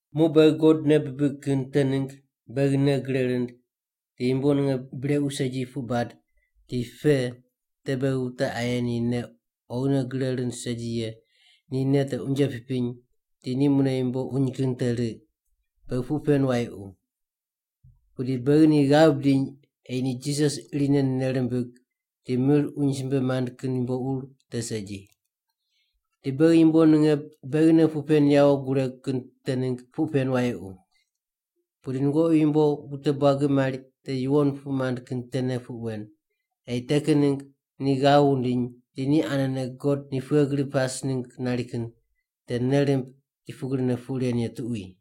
Muq beghi God nei bibig kin te ningg beghi nei gre rind di yumbo ninge brequ segi puq bad di pe te beghi wute aye ni nei oghine gre rind segi ye ni nei te unje pipiny di ni mune yumbo uny kin te riq. Beghi puq pen wayequ. Pudi beghi ni ghav bidiny ei ni Jisas irine nei rimbig di mir uny simbe mand kin yumbo ur te segi. Di beghi yumbo ninge beghine puq pen yawo guregu kin te ningg puq pen wayequ. Pudi nungoqi yumbo wute buagi mari te yuwon puq mand kin tene puq wen, ei te kin ningg ni ghav wundiny di ni anene God ni pughe gri pas ningg nari kin te nei rimb di pugrine puq ren ye tuqui.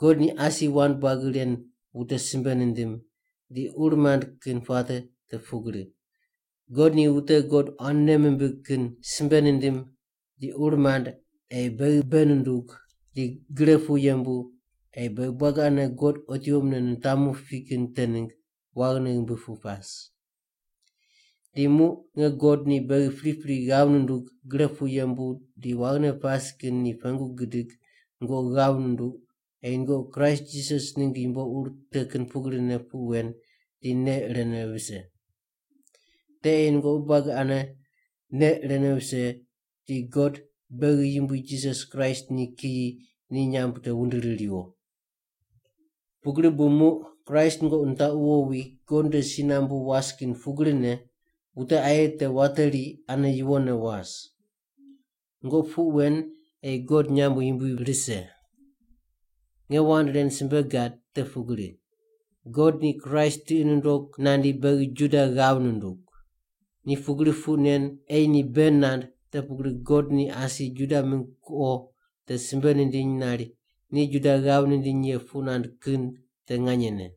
God ni asi wand buagi ren wute simbe nindim di ur mand kin puate te pugri. God ni wute God quan nei mimbig kin simbe nindim di ur mand ei beghi bei nundug di gre pu yembu ei beghi buagi ane God otiwo mune nitamu pi kin te ningg waghine ghimbi pu pas. Di muq nge God ni beghi pripri ghav nundug gre pu yembu di waghine pas kin ni pengu gidig nungoqi ghav nunduq ei nungoqi Kraist Jisas ningg yumbo ur te kin pugrine puq wen di nei irene vise. Te ei nungoqi buagi ane nei irene vise di God, beghi Yumbui Jisas Kraist ni kiyi ni nyamb te wundiri riwo. Pugri bu muq Kraist nungoqi nitaqu wowi God nde si nambu was kin pugrine, wute aye te wateri ane yuwonne was. Nungoqi puq wen ei God nyamb yumbui rise. Nge wand ren simbe gad te pugri. God ni Kraist tiqi nundog nandi beghi Juda ghav nundug. Ni pugri puq nen ei ni bei nand te pugri God ni asi Juda mingg kuqo te simbe nindiny nari ni Juda ghav nindiny ye puq nand kin te nganyene.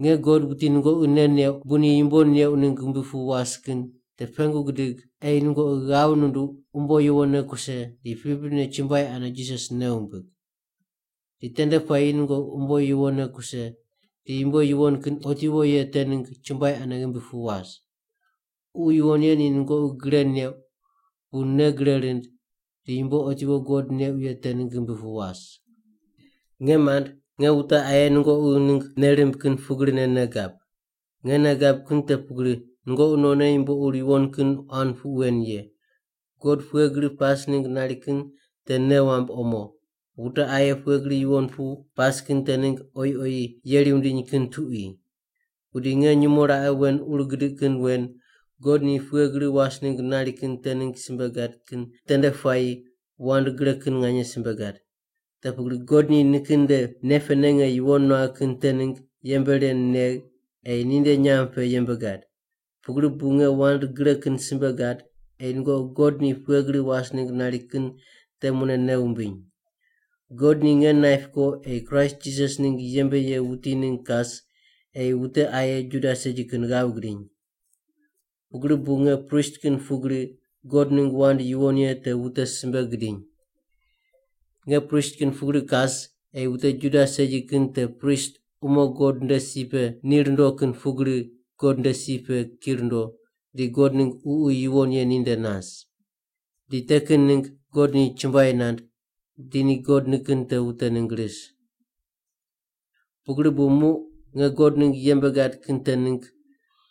Nge God wuti nungoqi nei neuq bu ni yumbo neuq ningg ghimbi pu was kin te pengu gidig ei nungoqi ghav nunduq umbo yuwonne kuse di priprine chumbuai ane Jisas nei wumbig. Di tende puayi nungoqi umbo yuwonne kuse di yumbo yuwon kin otiwo ye te ningg chumbuai ane ghimbi pu was. Ququ Yuwon Ye ni nungoqi gre neuq bu nei gre rind di yumbo otiwo God neuq ye te ningg ghimbi pu was. Nge mand, nge wute aye nungoqi ningg nei rimb kin pugrine nei gab. Nge nei gab te pugri nungoqi nonne yumbo ur yuwon kin quan puq wen ye, God pughe gri pas ningg nari kin te nei wamb omo, wute aye pughe gri yuwon pu pas kin te ningg oyi oyi yeri wundiny kin tuqui. Pudi nge nyumo raqe wen ur gidiq kin wen God ni pughe gri was ningg nari kin te ningg simbe gad kin tende puayi wand gre kin nganye simbe gad. Te pugri God ni nikin nde nei pene nge yuwon nuagh kin te ningg yembe ren negh ei ninde nyamb pe yembe gad. Pugri bu nge wand gre kin simbe gad ei nungoqi God ni pughe gri was ningg nari kin te mune nei wumbiny. God ni nge naip ko ei Kraist Jisas ningg yembe ye wuti ningg kas ei wute aye Juda segi kin ghav gidiny. Pugri bu nge prist kin pugri God ningg wand yuwon ye te wute simbe gidiny. Nge prist kin pugri kas ei wute Juda segi kin te prist umo God nde si pe ni rundo kin pugri God nde si pe ki rundo di God ningg Ququ Yuwon Ye ninde nas. Di te kin ningg God ni chumbuai nand di ni God nikin te wute ningg ris. Pugri bu muq nge God ningg yembe gad kin te ningg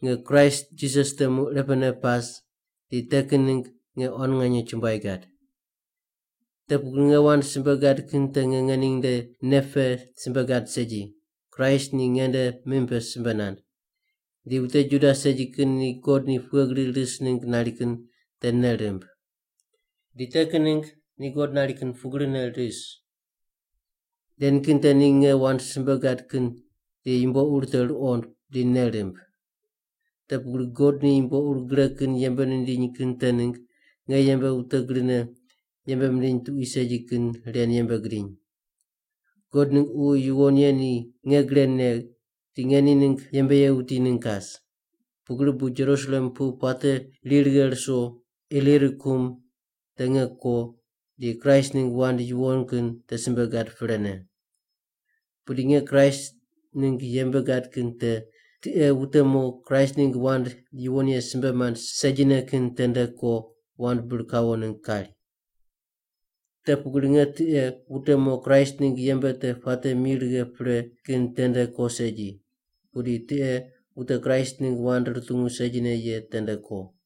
nge Kraist Jisas temu irepene pas di te kin ningg nge quan nganye chumbuai gad. Te pugri nge wand simbe gad kin te nge ngening nde nei pe simbe gad segi, Kraist ni ngende mim pe simbe nand, di wute Juda segi kin ni God ni pughe gri ris ningg nari kin te nei rimb. Di te kin ningg ni God nari kin pugrine ris. Ren kin te ni nge wand simbe gad kin di yumbo ur te ruqond di nei rimb. Te pugri, God ni yumbo ur gre kin yembe nindiny kin te ningg nge yembe wute grine yembe mindiny tuqui segi kin ren yembe gidiny. God ningg Ququ Yuwon Ye ni nge gre negh di nge ni ningg yembe ye wuti ningg kas. Pugri bu Jerusalem pu puate ri righe ruso Ilirikum, te nge ko di Kraist ningg wand yuwon kin te simbe gad prene. Pudi nge Kraist ningg yembe gad kin te tiqe wute mo Kraist ningg wand yuwon ye simbe mand segine kin tende ko wand bir kawo ningg kari. Te pugri nge tiqe wute mo Kraist ningg yembe te puate mi righe pre kin tende ko segi, pudi tiqe wute Kraist ningg wand rutungu segine ye tende ko.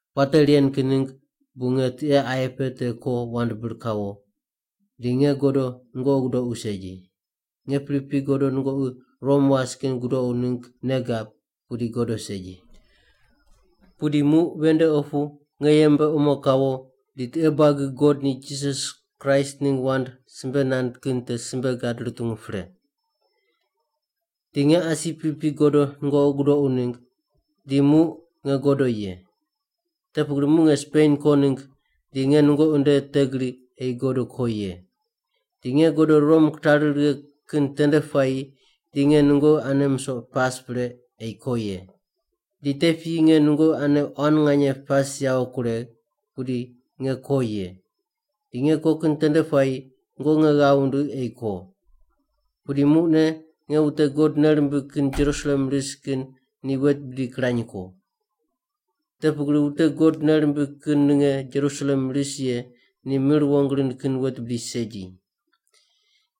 Puate ren kin ningg bu nge tiqe aye pe te ko wand bir kawo, di nge godo nungoqi gudoqu segi. Nge pripri godo nungoqi Rom was kin gudoqu ningg nei gab pudi godo segi. Pudi muq ven nde opu nge yembe omo kawo di tiqe buagi God ni Jisas Kraist ningg wand simbe nand kin te simbe gad rutungu pre. Di nge asi pripri godo nungoqi gudoqu ningg, di muq nge godo ye. Te pugri muq nge Spen ko ningg di nge nungoqi nde te gri ei godo ko ye. Di nge godo Rom kitari righe kin tende puayi di nge nungoqi ane misoq pas pre ei ko ye. Di te piyi nge nungoqi ane quan nganye pas yawo kuregh, pudi nge ko ye. Di nge ko kin tende puayi nungoqi nge ghav wundigh ei ko. Pudi muqne nge wute God nei rimbig kin Jerusalem ris kin ni wet bidi kirany ko. Te pugri wute God nei rimbig kin ninge Jerusalem ris ye ni mir wong rind kin wet bidi segi.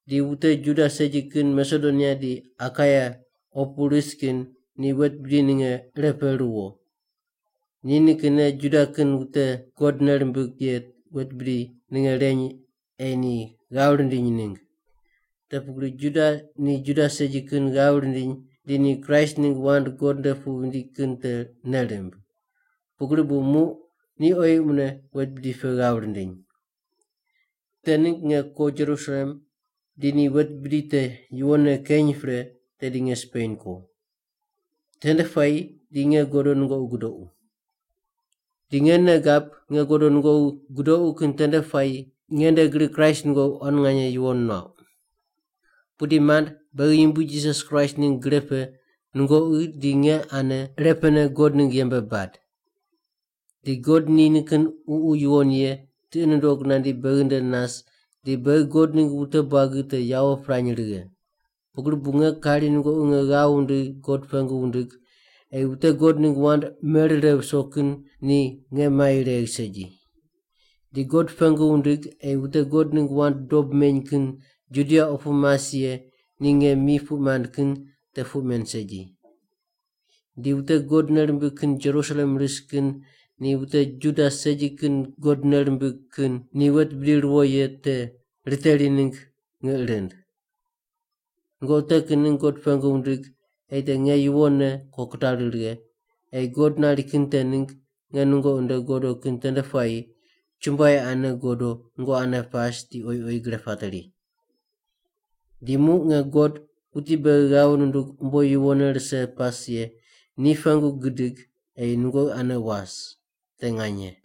Di wute Juda segi kin Masedonia di Akaia opu ris kin ni wet bidi ninge ire pe ruwo. Ni nikinne Juda kin wute God nei rimbig ye wet bidi ninge reny ei ni ghav rindiny ningg. Te pugri, Juda ni Juda segi kin ghav rindiny di ni Kraist ningg wand God nde pu vindi kin te nei rimb. Pugri bu muq ni oyi mune wet bidi pe ghav rindiny. Te ningg nge ko Jerusalem di ni wet bidi te yuwonne keny pre tedi nge Spen ko. Tende puayi di nge godo nungoqi gudoqu. Di nge nei gab nge godo nungoqi gudoqu kin tende puayi nge nde gri Kraist nungoqi quan nganye yuwon nuauq. Pudi mand, beghi Yumbui Jisas Kraist ningg gre pe nungoqi di nge ane irepene God ningg yembe bad. Di God ni nikin Ququ Yuwon Ye tiqi nundog nandi beghi nde nas di beghi God ningg wute buagi te yawo pirany righe. Pugri bu nge kari nungoqi nge ghav wundigh God pengu wundig ei wute God ningg wand merire viso kin ni nge mai regh segi. Di God pengu wundig ei wute God ningg wand dob meny kin Judia opu mas ye ni nge mi puq mand kin te puq men segi. Di wute God nei rimbig kin Jerusalem ris kin ni wute Juda segi kin God nei rimbig kin ni wet bidi ruwo ye te riteri ningg ngiq rind. Nungoqi te kin ningg God pengu wundig ei te nge yuwonne ko kitari righe, ei God nari kin te ningg nge nungoqi nde godo kin tende puayi, chumbuai ane godo nungoqi ane pas di oyi oyi gre pateri. Di muq nge God, wuti beghi ghav ndug umbo yuwonne rise pas ye ni pengu gidig ei nungoqi ane was. Te nganye.